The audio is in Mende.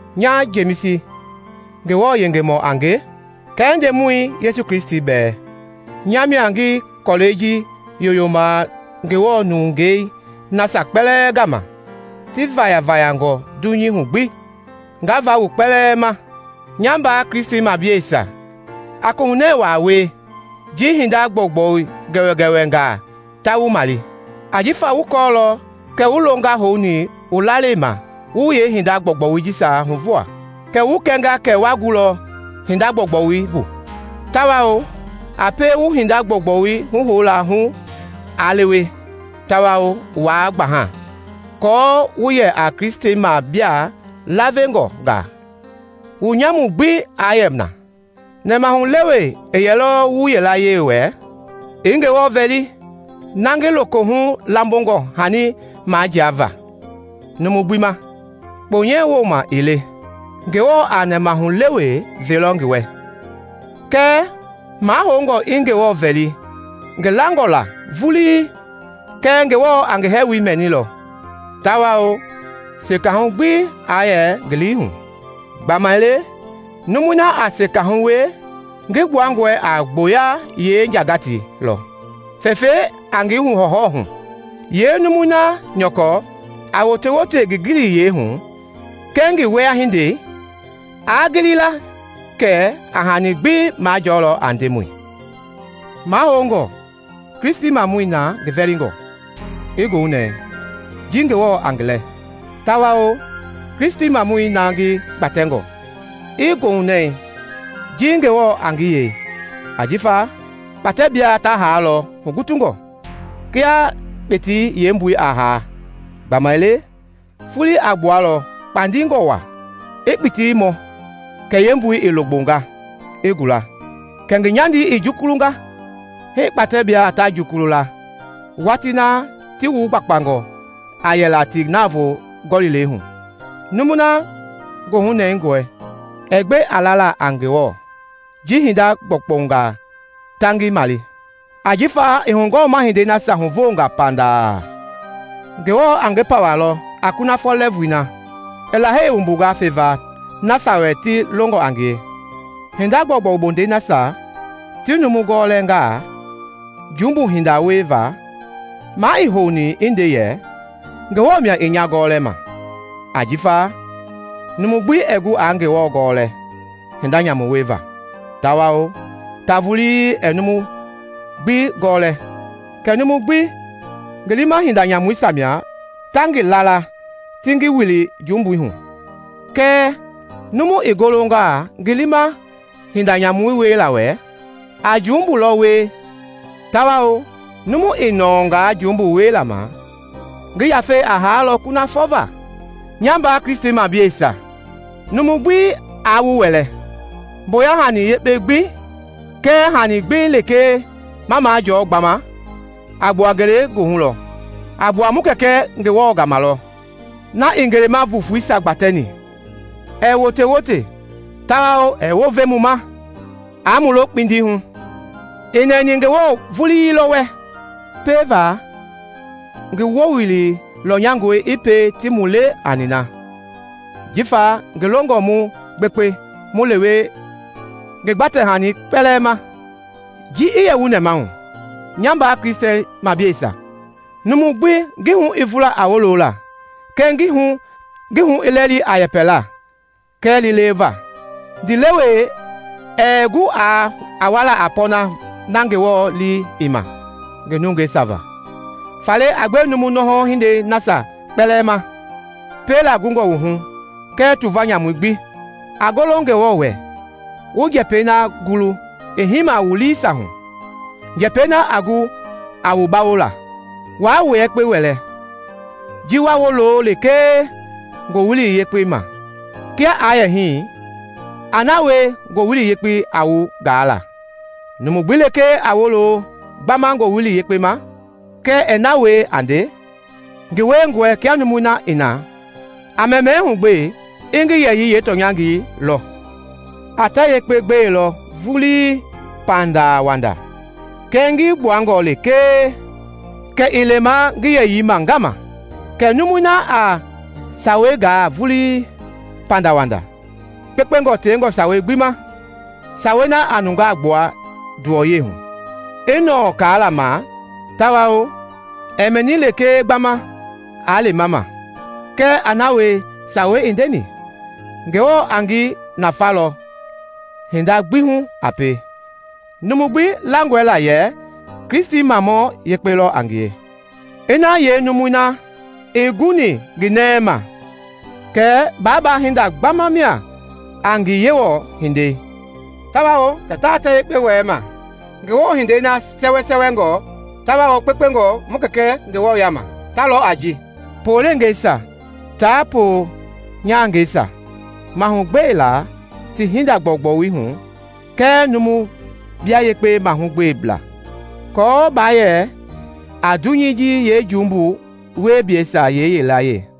Nya Jemisi, Ngewɔ yengemɔ a nge kɛɛ Ndemɔi Yesu Kristi bɛɛ, nya mia ngi kɔlɛi ji yoyoma Ngewɔ nungei nasia kpɛlɛɛ gama ti vayafayangɔ dunyei hu gbi. Nga va wu kpɛlɛɛ ma. Nya mbaa Kristimableisia, a koohunɛɛ waa wie ji hinda gbɔugbɔu gɛwɛgɛwɛngaa ta wu male, ajifa wu kɔɔlɔ kɛ wu longaa houni wu lalei ma wu yeehinda gbɔugbɔisia huvo, kɛ wu kɛnga kɛ wa gulɔ hinda gbɔugbɔu bu. Tawao a pie wu hinda gbɔugbɔu huhoulɛi hu aa lewe tawao waa gbaha, aako wu yɛ a Kristimablaa lavengɔngaa, wu nyamu gbi aa yɛ na! Nɛmahulewe ii yɛlɔ wu yilaye wɛ, i Ngewɔ vɛli, na ngi lokohu lambongɔ hani majiava numu gbi ma, kponyɛ wooma ii le, Ngewɔ a nɛmahulewe velɔ ngi wɛ. Kɛɛ mahoungɔ i Ngewɔ vɛli ngi langɔ la vulii kɛ Ngewɔ a ngi hɛɛwoi mɛnilɔ, tawao sekahu gbi aa yɛ ngi lii hu, gbamaile numui na a sekahu wie ngi gbuangɔ a gboyei yeenjagatei lɔ fɛfɛi a ngi hɔwɔhɔwɔ hu. Yeenumui na nyɔkɔ, a wotewote ngi giliyii hu kɛɛ ngi wiehindei, aa gili la kɛ a hani gbi majɔɔlɔ a Ndemɔi. Mahoungɔ Kristimamɔi na ngi vɛlingɔ i goohunɛɛ ji Ngewɔ a ngi lɛ, tawao Kristimamɔi na ngi gbatɛngɔ i goohunɛɛ ji Ngewɔ a ngi yei. Ajifa kpatɛblaa ta haalɔ hugutungɔ kia kpitii yeepuɛi a haa. Gbamaile folei a gbualɔ kpandingɔ waa i kpitii mɔ kɛ yeepuɛi i logbonga i gula, kɛ ngi nyandei i jukulunga. Hii kpatɛblaa jukulu watii na ti wugbakpangɔ a yɛla ti navoo gɔlilei hu. Numui na goohu nɛngɔe ɛɛ gbe a lala a Ngewɔ ji hinda gbɔugbɔngaa ta ngi male, ajifa i hugɔɔmahindei nasia huvoongaa pandaa, Ngewɔ a ngi pawalɔ a kunafɔ lɛɛvui na i Lahei wumbunga feva nasia wɛ ti longɔ a ngie. Hinda gbɔugbɔu bondɛi nasia ti numu gɔlɛngaa jumbu hinda wieva, maa ii houni i nde yɛ, “Ngewɔ mia i nya gɔlɛma;” ajifa numu gbi ɛɛ gu aa Ngewɔ gɔlɛ hinda nyamu wieva, tawao ta vulii ɛɛ numu gbi gɔlɛ. Kɛɛ numu gbi ngi liima hinda nyamuisia mia ta ngi laala ti ngi wili jumbui hu. Kɛɛ numu i golongaa ngi liima hinda nyamui wiela wɛ, a jumbui lɔ wie tawao numu i nɔɔngaa jumbui wiela ma, ngi yafei a haalɔ kunafɔ va. Nya mbaa Kristimableisia, numu gbi aa wu wɛlɛ. Mboya hani yekpe gbi kɛɛ hani gbi lekee ma majɔɔ gbama, a gbua ngelegoohu lɔ; a gbua mu Kɛkɛ Ngewɔ gama lɔ na i ngelema voofoisia gbatɛni, ɛɛ wotewote tawao ɛɛ wounve mu ma aa mu lo kpindi hu. I nɛni Ngewɔ vulii lɔ wɛ pieva ngi wowili lɔnyangɔe i pie ti mu le a nina jifa ngi longɔ mu gbekpe mu lewe ngi gbatɛ-hanii kpɛlɛɛ ma. Ji i yɛ wu nɛmahu, nya mbaa Kristimableisia, numu gbi ngi hu i vula a wolola, kɛɛ ngi hu i lɛli a yɛpɛla kɛɛ liileweva. Ndiilewe ɛɛ gu a wala a pɔɔnɛi na Ngewɔ lii i ma ngi nungeisia va. Faale a gbe numu nɔhɔ hindei nasia kpɛlɛɛ ma piela gungɔ wu hu kɛɛ tuva nyamui gbi. A golo Ngewɔ wɛ wu njɛpɛi na gulu i hiima wu liisia hu, njɛpɛi na a gu a wu bawola. Waa wua yekpe wɛlɛ a ji wa wolo lekee Ngowili Yekpei ma; kia aa yɛ hii, a na wie Ngowili Yekpei a wu gaa la. Numu gbi lekee a wolo gbama Ngowili Yekpei ma kɛɛ ɛɛ na wie a nde, ngi wiengɔe kia numui i na a mɛmɛɛ hugbee i ngi yɛyii yeetɔnyangɔi lɔ. A ta yekpe gbelɔ vulii pandawanda kɛɛ ngi gbuangɔ lekee kɛ i lema ngi yɛyii ma ngaama. Kɛɛ numui na a sawei gaa vulii pandawanda kpekpengɔ tewengɔ sawei gbi ma, sawei na a nungaa gbua nduwɔya hu, i nɔɔ kaala ma tawao ɛɛ mɛni lekee gbama aa lema ma, kɛɛ a na wie yeesawei i ndeni, Ngewɔ a ngi nafalɔ hinda gbi hu a pie. Numu gbi langɔe la yɛ Kristimamɔ yekpe lɔ a ngie? Ina yeenumui na ii guni ngi nɛi ma, kɛ baabaa-hinda gbama mia a ngi Yewɔ-hindei tawao kɛ taa ta yekpe wɛlɛma. Ngewɔ-hindei na sɛwɛsɛwɛngɔ tawao kpekpengɔ mu Kɛkɛ Ngewɔ yaama ta lɔ a ji: poleengeisia tia ponyahangeisia mahugbela ti hinda gbɔugbɔi hu kɛɛ numu bia yekpe mahugbela aako baa yɛ a dunyei ji yeejumbu wieblɛisia yilayee.